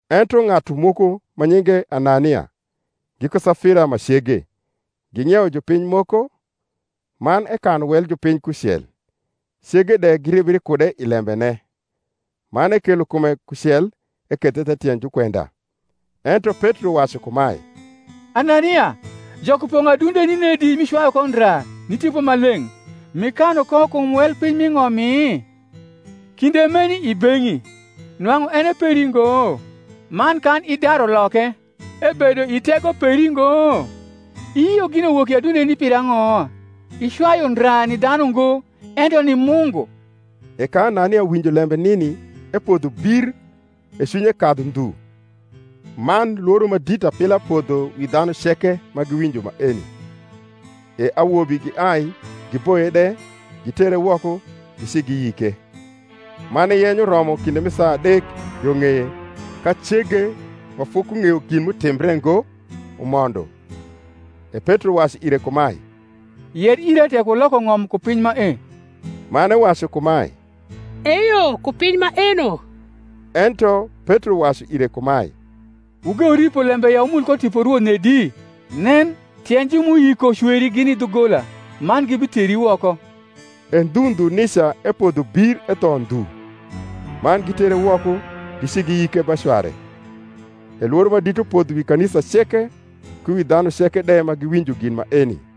Ento ng’atu moko ma nyinge Anania, giku Sahra ma cege, ging’iewo jupiny moko, man ekanu wel jupiny kucel, cege de giribri kude i lembene, man ekelo kume kucel, ekethe the tiend jukwenda. Ento Petro wacu kumae, Anania, Jok upong’o adunden inedi m’icwayu ko ndra ni Tipo Maleng’, m’ikanu ko kum welpiny mi ng’omi? Kinde m’eni i beng’i, nwang’u en e peri ngo? man kan idaru loke, ebedo i tego peri ngo? Iyio gino wok i adundeni pirang’o? icwayu ndra ni dhanu ngo, ento ni Mungu. E ka Anania winjo lembe nini epodho bir e cwinye kadhu ndhu; man lworo ma dit apila podho wi dhanu ceke ma giwinjo maeni. E awobi giai giboye de, gitere woko gicigiyike. Man eyenyo romo kinde mi saa adek yo ng’eye, ka cege, ma fokung’eyo gin m’utimbre ngo, umondo. E Petro wacu ire kumae, Yer ira tek wuloko ng’om ku piny mae. Man ewacu kumae, Eyo, ku piny maeno. Ento Petro wacu ire kumae, Wugewuripo lembe ya wumul ko Tipo Rwoth nedi? nen, tiend ju m’uyiko cweri gi ni dhugola, man gibiteri woko. E ndhu ndhu nica epodho bir etho ndhu, man gitere woko gicigiyike ba cware. E lworo ma dit upodho wi kanisa ceke, ku wi dhanu ceke de ma giwinjo gin maeni.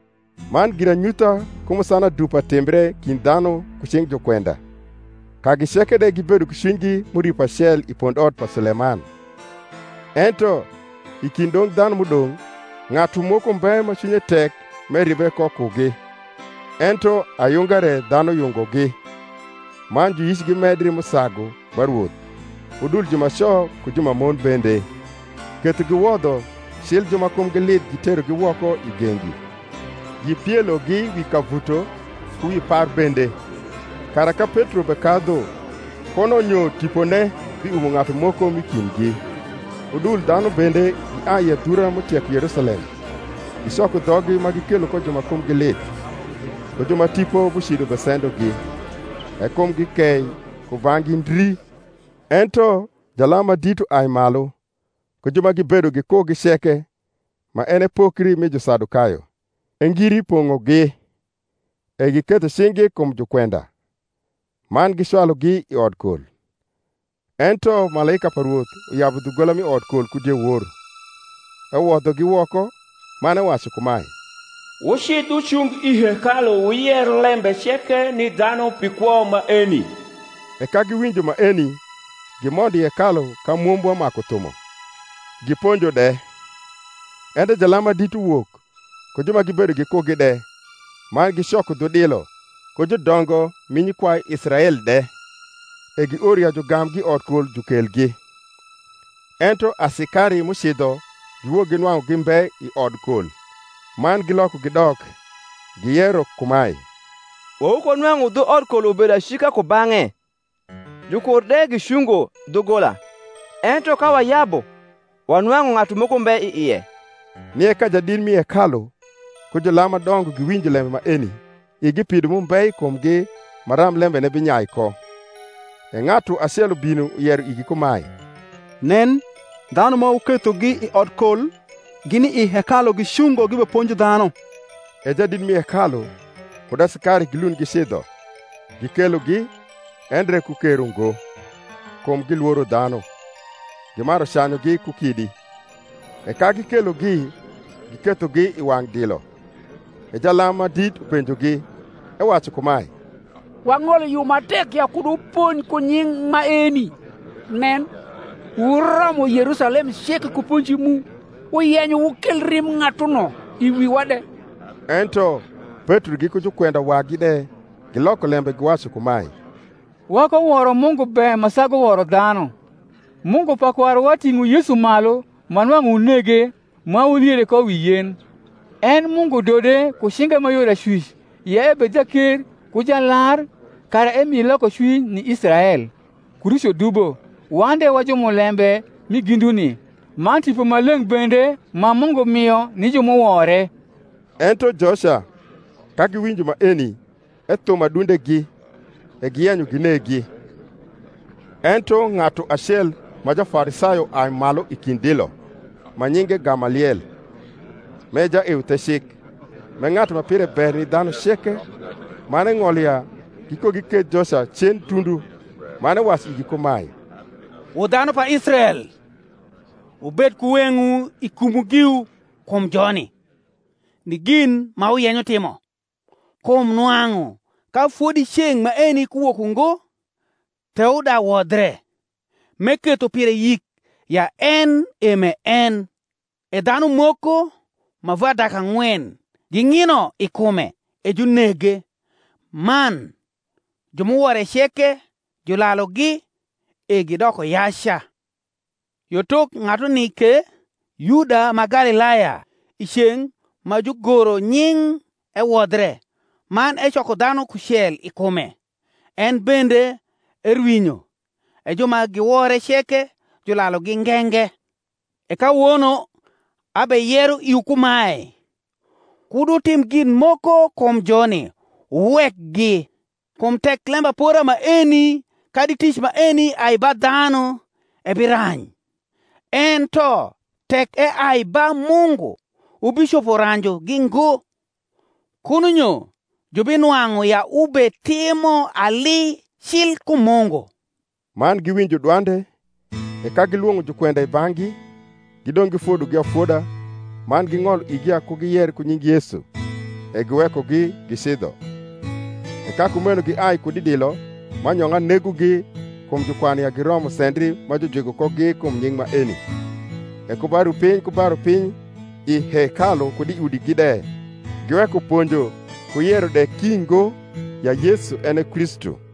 Man giranyutha ku musana dupa timbre kind dhanu ku cing’ jukwenda: kagi ceke de gibedo ku cwinygi m’uripo acel i pondot pa Suleman. Ento i kind dong’ dhanu m’udong’ ng’atu moko mbe ma cwinye tek m’eribre ko kugi: ento ayunga re dhanu yungogi; man juyic gimedri m’usagu ba Rwoth, udul jumaco ku jumamon bende: ketho giwodho cil ju ma kumgi lith giterogi woko i gengi, gipielogi wi kavuto ku wi par bende, kara ka Petro bekadhu, kuno nyo tipone biumo ng’atu moko m’i kindgi. Udul dhanu bende giai i adhura m’utieko Yerusalem, gicoko dhoggi ma gikelo ko ju ma kumgi lith, ku ju ma tipo m’ucido besendogi: e kumgi kei kubang’gi ndri. Ento jalam ma dit uai malu, ku ju ma gibedo gikugi ceke (ma en e pokri mi Jusadukayo), e ngiri pong’ogi e giketho cing’gi kum jukwenda, man gicwalugi i odkol. Ento malaika pa Rwoth uyabu dhugola mi odkol ku diewor, ewodhogi woko, man ewacu kumae, Wucidh wucung i hekalu wuyer lembe ceke ni dhanu pi Kwo maeni. E ka giwinjo maeni, gimondo i hekalu ka mombwa maku thumo, giponjo de. Ento jalam ma dit uwok, ku ju ma gibedo gikugi de, man gicoko dhu dilo, ku judongo mi nyikwai Israel de, e gioro ya jugamgi i odkol jukelgi. Ento asikari m’ucidho giwok ginwang’u gimbe i odkol; man giloko gidok, giyero kumae, Wawok wanwang’u dhu odkol ubedo acika kubang’e, jukur de gicungo dhugola: ento ka wayabu, wanwang’u ng’atu moko mbe i ie. Nie ka jadit mi hekalu ku julam ma dongo giwinjo lembe maeni, igi pido mumbe i kumgi maram lembene binyai ko. E ng’atu acel ubino uyero igi kumae, Nen, dhanu ma wukethogi i odkol gini i hekalu gicungo gibeponjo dhanu. E jadit mi hekalu kud asikari gilund gicidho, gikelogi, endre ku kero ngo; kum gilworo dhanu, gimaru canyugi ku kidi. E ka gikelogi, gikethogi i wang’ dilo. E jalam ma dit upenjogi, ewacu kumae, Wang’olo iwu ma tek ya kud wuponj ku nying’ maeni: nen, wuromo Yerusalem ceke ku ponji mu, wuyenyo wukel rimb ng’atuno i wiwa de. Ento Petro giku jukwenda wagi de giloko lembe giwacu kumae, Wakoworo Mungu be ma sagu woro dhanu. Mungu pa kwaruwa ting’o Yesu malu, ma nwang’u wunege, ma wuliere ko wi yen. En Mungu dode ku cinge ma yor acwic ya ebed Jaker ku Jalar, kara emi lokocwiny ni Israel, ku ruco dubo. Wan de wa jumulembe mi ginduni; man Tipo Maleng’ bende, ma Mungu mio ni ju m’uwore. Ento joca, ka giwinjo maeni, ethumo adundegi, e giyenyo gineggi. Ento ng’atu acel ma Jafarisayo ai malu i kind dilo, ma nyinge Gamaliel, m’e jaeuthecik, m’e ng’atu ma pire ber ni dhanu ceke, man eng’olo ya gikogiketh joca cen tundu. Man ewacu igi kumae, Wu dhanu pa Israel, wubed ku weng’wu i kumwu giwu kum joni, ni gin ma wuyenyo timo. Kum nwang’u ka fodi ceng’ maeni kuwok ungo Theuda wodhre, m’eketho pire yik ya en e m’e en; e dhanu moko, ma va dak ang’wen, ging’ino i kume: e junege; man ju m’uwore ceke, julalugi, e gidoko yaca. Yo tok ng’atuni ke, Yuda ma Galilaya i ceng’ ma jugoro nying’ ewodhre, man ecoko dhanu kucel i kume: en bende erwinyo; e ju ma giwore ceke, julalugi nge nge. E kawono abeyero iwu kumae, Kud wutim gin moko kum joni, wuwekgi: kum tek lembapora maeni kadi tic maeni ai ba dhanu, ebirany: ento tek eai ba Mungu, wubicopo ranjugi ngo; kuno nyo jubinwang’u ya wubetimo ali cil kum Mungu. Man giwinjo dwande: e ka gilwong’o jukwenda i bang’gi, gidong’ gifodogi afoda man ging’olo igi ya ku giyer ku nying’ Yesu, e giwekogi gicidho. E ka kumeno giai kud i dilo, ma anyong’a negogi kum jukwanu ya giromo sendri ma jujwigo kogi kum Nying’ maeni. E ku ba rupiny ku ba rupiny, i hekalu kud i udigi de, giweko ponjo ku yero de ki ngo ya Yesu en e Kristu.